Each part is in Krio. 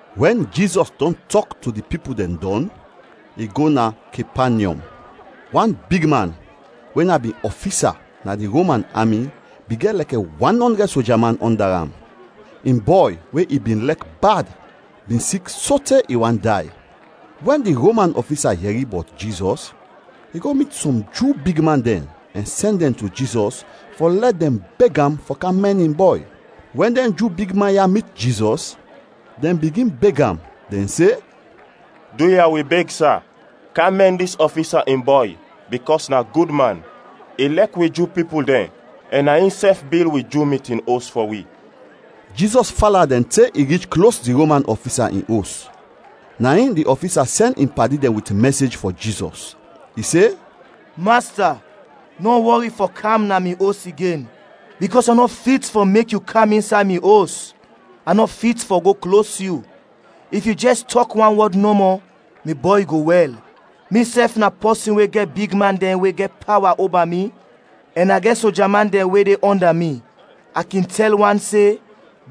Wɛn Jizɔs dɔn tɔk to di pipul dɛn dɔn, i go na Kepanyɔm. Wan bigman we na bin ɔfisa na di Roman ami bin gɛt lɛkɛ wan ɔndrɛd soja man ɔnda am. In bɔy we i bin lɛk bad bin sik sote i want day. Wɛn di Roman ɔfisa yɛri bɔt Jizɔs, i go mit sɔm Ju big man dɛn ɛn sɛn dɛn to Jizɔs fɔ lɛ dɛn beg am fɔ kam mɛn in bɔy. Wɛn dɛn Ju bigman ya mit Jizɔs, dɛn bigin beg am, dɛn se, “Duya, wi beg, sa, kam mɛn dis ɔfisa in bɔy bikɔs na gud man. I lɛk wi Ju pipul dɛn ɛn na insɛf bil wi Ju mitin os fɔ wi.” Jizɔs fala dɛn go te i rich klos di Roman ɔfisa in os. Na in di ɔfisa sɛn in padi dɛn wit mɛsej fɔ Jizɔs; i se, “Masta, nɔ wɔri fɔ kam na mi os igen, bikɔs a nɔ fit fɔ mek yu kam insay mi os; a nɔ fit fɔ go klos yu. If yu jɛs tɔk wan wɔd nɔmɔ, mi bɔy go wɛl. Misɛf na pɔsin we gɛt bigman dɛn we gɛt pawa oba mi ɛn a gɛt soja man dɛn we de ɔnda mi. A kin tɛl wan se,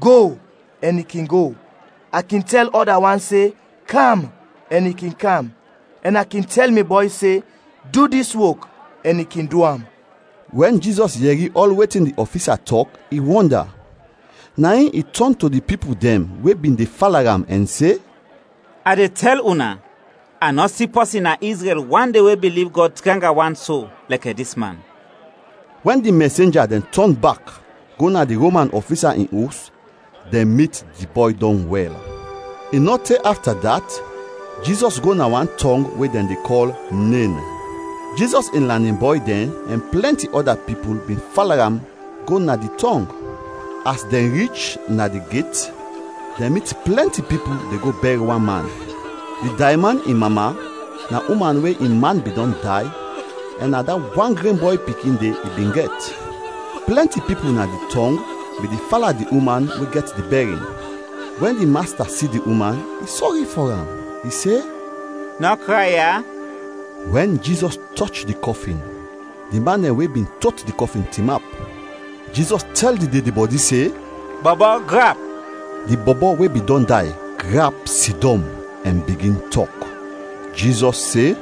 ‘Go!’ ɛn i kin go; a kin tɛl ɔda wan se, ‘Kam!’ ɛn i kin kam; ɛn a kin tɛl mi bɔy se, ‘Du dis wok!’ ɛn i kin du am.” Wɛn Jizɔs yɛri ɔl wetin di ɔfisa tɔk, i wɔnda. Na in i tɔn to di pipul dɛn we bin de fala am ɛn se, “A de tɛl una, a nɔ si pɔsin na Izrɛl wande we biliv Gɔd tranga wan so lɛkɛ dis man.” Wɛn di mɛsenja dɛn tɔn bak go na di Roman ɔfisa in os, dɛn mit di bɔy dɔn wɛl. I nɔ te afta dat, Jizɔs go na wan tɔng we dɛn de kɔl Nen. Jizɔs in lanin bɔy dɛn ɛn plɛnti ɔda pipul bin fala am go na di tɔng. As dɛn rich na di get dɛn mit plɛnti pipul de go bɛr wan man. Di dayman in mama na uman we in man bin dɔn day ɛn na da wan gren bɔy pikin de i bin gɛt. Plɛnti pipul na di tɔng bin de fala di uman we gɛt di bɛrin. Wɛn di Masta si di uman, i sɔri fɔ am, i se, “Nɔ kray ya!” Wɛn Jizɔs tɔch di kɔfin, di man dɛn we bin tot di kɔfin tinap. Jizɔs tɛl di dedebɔdi se, “Bɔbɔ, grap!” Di bɔbɔ we bin dɔn day grap sidɔm ɛn bigin tɔk. Jizɔs se,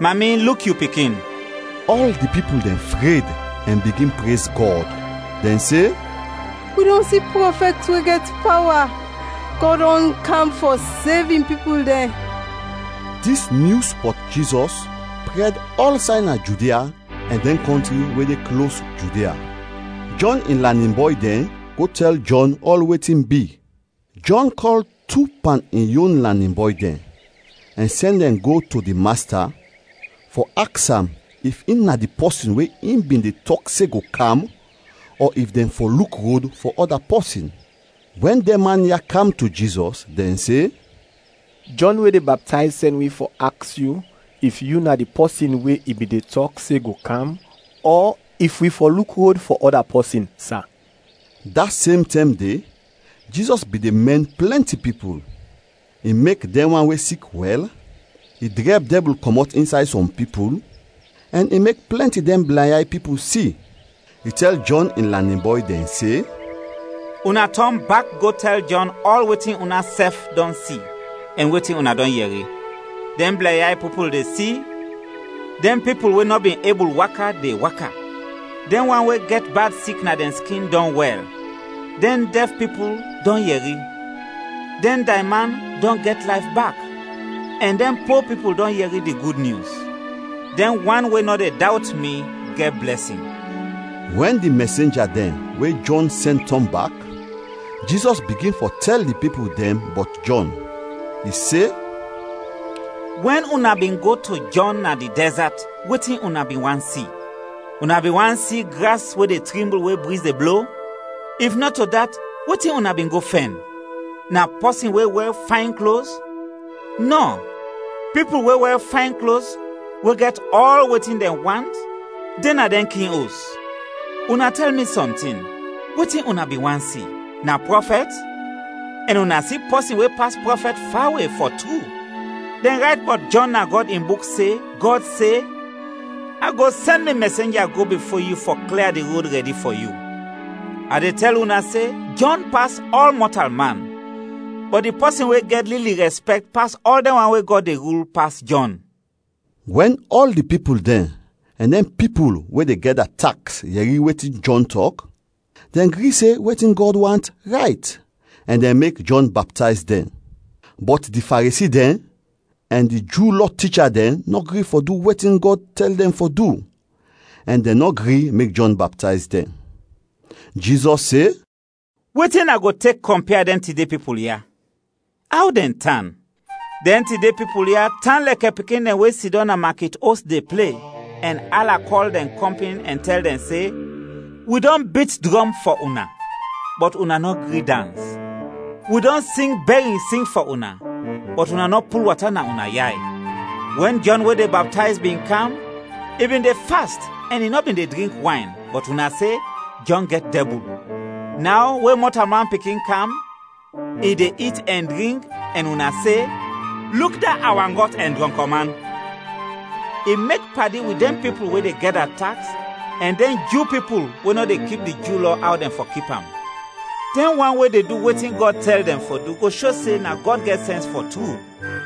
“Mami, luk yu pikin!” Ɔl di pipul dɛn fred ɛn bigin prez Gɔd. Dɛn se, “Wi dɔn si prɔfɛt we gɛt pawa! Gɔd dɔn kam fɔ sev in pipul dɛn!” Dis nyus bɔt Jizɔs prɛd ɔlsay na Judia ɛn dɛn kɔntri we de klos Judia. Jɔn in lanin bɔy dɛn go tɛl Jɔn ɔl wetin bi. Jɔn kɔl tu pan in yon lanin bɔy dɛn ɛn sɛn dɛn go to di Masta fɔ aks am if in na di pɔsin we in bin de tɔk se go kam ɔ if dɛn fɔ luk rod fɔ ɔda pɔsin. Wɛn dɛn man ya kam to Jizɔs, dɛn se, “Jɔn we de baptayz sɛn wi fɔ aks yu if yu na di pɔsin we i bin de tɔk se go kam ɔ if wi fɔ luk rod fɔ ɔda pɔsin, sa?” Da sem tɛm de, Jizɔs bin de mɛn plɛnti pipul; i mek dɛn wan we sik wɛl, i drɛb dɛbul kɔmɔt insay sɔm pipul, ɛn i mek plɛnti dɛn blɛnyay pipul si. I tɛl Jɔn in lanin bɔy dɛn se, “Una tɔn bak go tɛl Jɔn ɔl wetin unasɛf dɔn si ɛn wetin una dɔn yɛri; dɛn blɛnyay pipul de si, dɛn pipul we nɔ bin ebul waka, de waka, dɛn wan we gɛt bad sik na dɛn skin dɔn wɛl, dɛn dɛf pipul dɔn yɛri, dɛn dayman dɔn gɛt layf bak, ɛn dɛn po pipul dɔn yɛri di Gud Nyus. Dɛn wan we nɔ de dawt mi gɛt blɛsin!” Wɛn di mɛsenja dɛn we Jɔn sɛn tɔn bak, Jizɔs bigin fɔ tɛl di pipul dɛn bɔt Jɔn. I se, “Wɛn una bin go to Jɔn na di dɛzat, wetin una bin want si? Una bin want si gras we de trimbul we briz de blo? If nɔto dat, wetin una bin go fɛn? Na pɔsin we wɛr fayn klos? Nɔ; pipul we wɛr fayn klos we gɛt ɔl wetin dɛn want de na dɛn king os! Una tɛl mi sɔntin, wetin una bin want si? Na prɔfɛt? Ɛn una si pɔsin we pas prɔfɛt fawe, fɔ tru. Dɛn rayt bɔt Jɔn na Gɔd in Buk se, Gɔd se, ‘A go sɛn mi mɛsenja go bifo yu fɔ klia di rod rɛdi fɔ yu!’ A de tɛl una se Jɔn pas ɔl mɔtalman, bɔt di pɔsin we gɛt lili rɛspɛkt pas ɔl dɛn wan we Gɔd de rul, pas Jɔn!” Wɛn ɔl di pipul dɛn ɛn dɛn pipul we de gɛda taks yɛri wetin Jɔn tɔk, dɛn gri se wetin Gɔd want, rayt, ɛn dɛn mek Jɔn baptayz dɛn. Bɔt di Faresi dɛn ɛn di Ju Lɔ ticha dɛn nɔ gri fɔ du wetin Gɔd tɛl dɛn fɔ du ɛn dɛn nɔ gri mek Jɔn baptayz dɛn. Jizɔs se, “Wetin a go tek kɔmpia dɛn tide pipul ya? Aw dɛn tan? Dɛn tide pipul ya tan lɛkɛ pikin dɛn we sidɔm na makit os de ple, ɛn ala kɔl dɛn kɔmpin ɛn tɛl dɛn se, ‘Wi dɔn bit drɔm fɔ una, bɔt una nɔ gri dans! Wi dɔn sing bɛrin sing fɔ una, bɔt una nɔ pul wata na una yay!’ Wɛn Jɔn we de baptayz bin kam, i bin de fast ɛn i nɔ bin de drink wayn, bɔt una se, ‘Jɔn gɛt dɛbul.’ Naw we Mɔtalman Pikin kam, i de it ɛn drink ɛn una se, ‘Luk da awangɔt ɛn drɔnk man! I mek padi wit dɛn pipul we de gɛda taks ɛn dɛn Ju pipul we nɔ de kip di Ju Lɔ aw dɛn fɔ kip am!’ Dɛn wan we de du wetin Gɔd tɛl dɛn fɔ du go sho se na Gɔd gɛt sɛns fɔ tru.”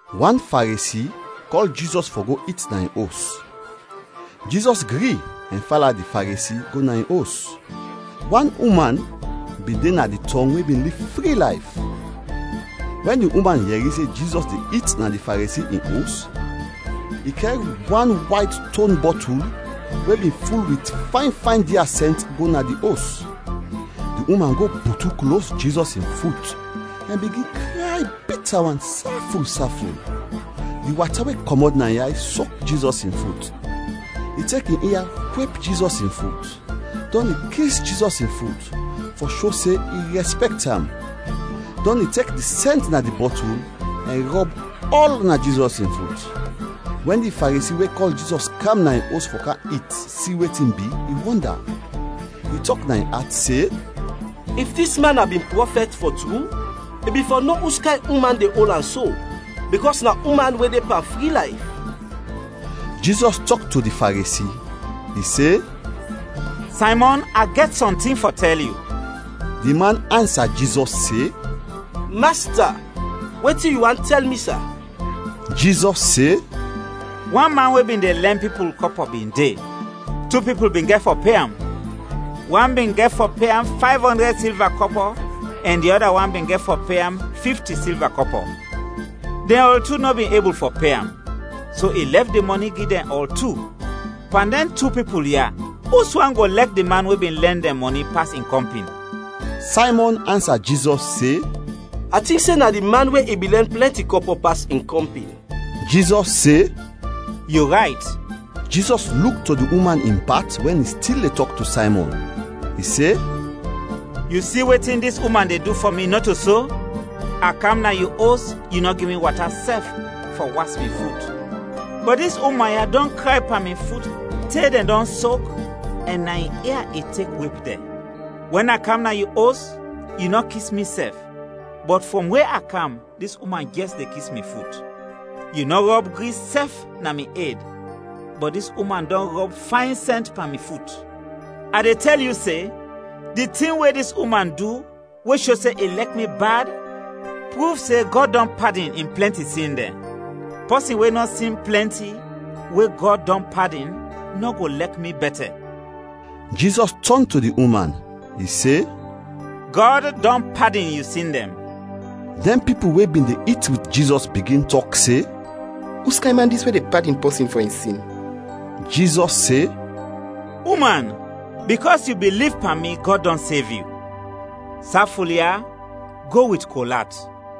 Wan Faresi kɔl Jizɔs fɔ go it na in os. Jizɔs gri ɛn fala di Faresi go na in os. Wan uman bin de na di tɔng we bin liv fri layf. Wɛn di uman yɛri se Jizɔs de it na di Faresi in os, i kɛr wan wayt ston bɔtul we bin ful wit fayn fayn dia sɛnt, go na di os. Di uman go butu klos Jizɔs in fut ɛn bigin kray bita wan saful saful. Di wata we kɔmɔt na in yay sok Jizɔs in fut. I tek in ia wep Jizɔs in fut, dɔn i kis Jizɔs in fut fɔ sho se in rɛspɛkt am, dɔn i tek di sɛnt na di bɔtul ɛn rɔb ɔl na Jizɔs in fut. Wɛn di Faresi we kɔl Jizɔs kam na in os fɔ kam it si wetin bi, i wɔnda, i tɔk na in at se, “If dis man na bin prɔfɛt, fɔ tru, i bin fɔ no uskayn uman de ol am so, bikɔs na uman we de pan fri layf.” Jizɔs tɔk to di Faresi. I se, “Saymɔn, a gɛt sɔntin fɔ tɛl yu.” Di man ansa Jizɔs se, “Masta, wetin yu want tɛl mi, sa?” Jizɔs se, “Wan man we bin de lɛn pipul kɔpɔ bin de; tu pipul bin gɛt fɔ pe am. Wan bin gɛt fɔ pe am fayv ɔndrɛd silva kɔpɔ ɛn di ɔda wan bin gɛt fɔ pe am fifti silva kɔpɔ. Dɛn ɔl tu nɔ bin ebul fɔ pe am, so i lɛf di mɔni gi dɛn ɔl tu. Pan dɛn tu pipul ya, uswan go lɛk di man we bin lɛn dɛn mɔni pas in kɔmpin?” Saymɔn ansa Jizɔs se, “A tink se na di man we i bin lɛn plɛnti kɔpɔ pas in kɔmpin.” Jizɔs se, “Yu rayt.” Jizɔs luk to di uman in pat wɛn i stil de tɔk to Saymɔn. I se, “Yu si wetin dis uman de du fɔ mi, nɔto so? A kam na yu os, yu nɔ gi mi wata sɛf fɔ was mi fut, bɔt dis uman ya dɔn kray pan mi fut te dɛn dɔn sok ɛn na in ia i tek wep dɛn. Wɛn a kam na yu os, yu nɔ kis mi sɛf, bɔt frɔm we a kam, dis uman jɛs de kis mi fut. Yu nɔ rɔb gris sɛf na mi ed, bɔt dis uman dɔn rɔb fayn sɛnt pan mi fut. A de tɛl yu se, di tin we dis uman du we sho se i lɛk mi bad pruv se Gɔd dɔn padin in plɛnti sin dɛn. Pɔsin we nɔ sin plɛnti, we Gɔd dɔn padin, nɔ go lɛk mi bɛtɛ.” Jizɔs tɔn to di uman. I se, “Gɔd dɔn padin yu sin dɛn!” Dɛn pipul we bin de it wit Jizɔs bigin tɔk se, “Uskayn man dis we de padin pɔsin fɔ in sin?” Jizɔs se, “Uman, bikɔs yu biliv pan mi, Gɔd dɔn sev yu. Saful ya, go wit kol at!”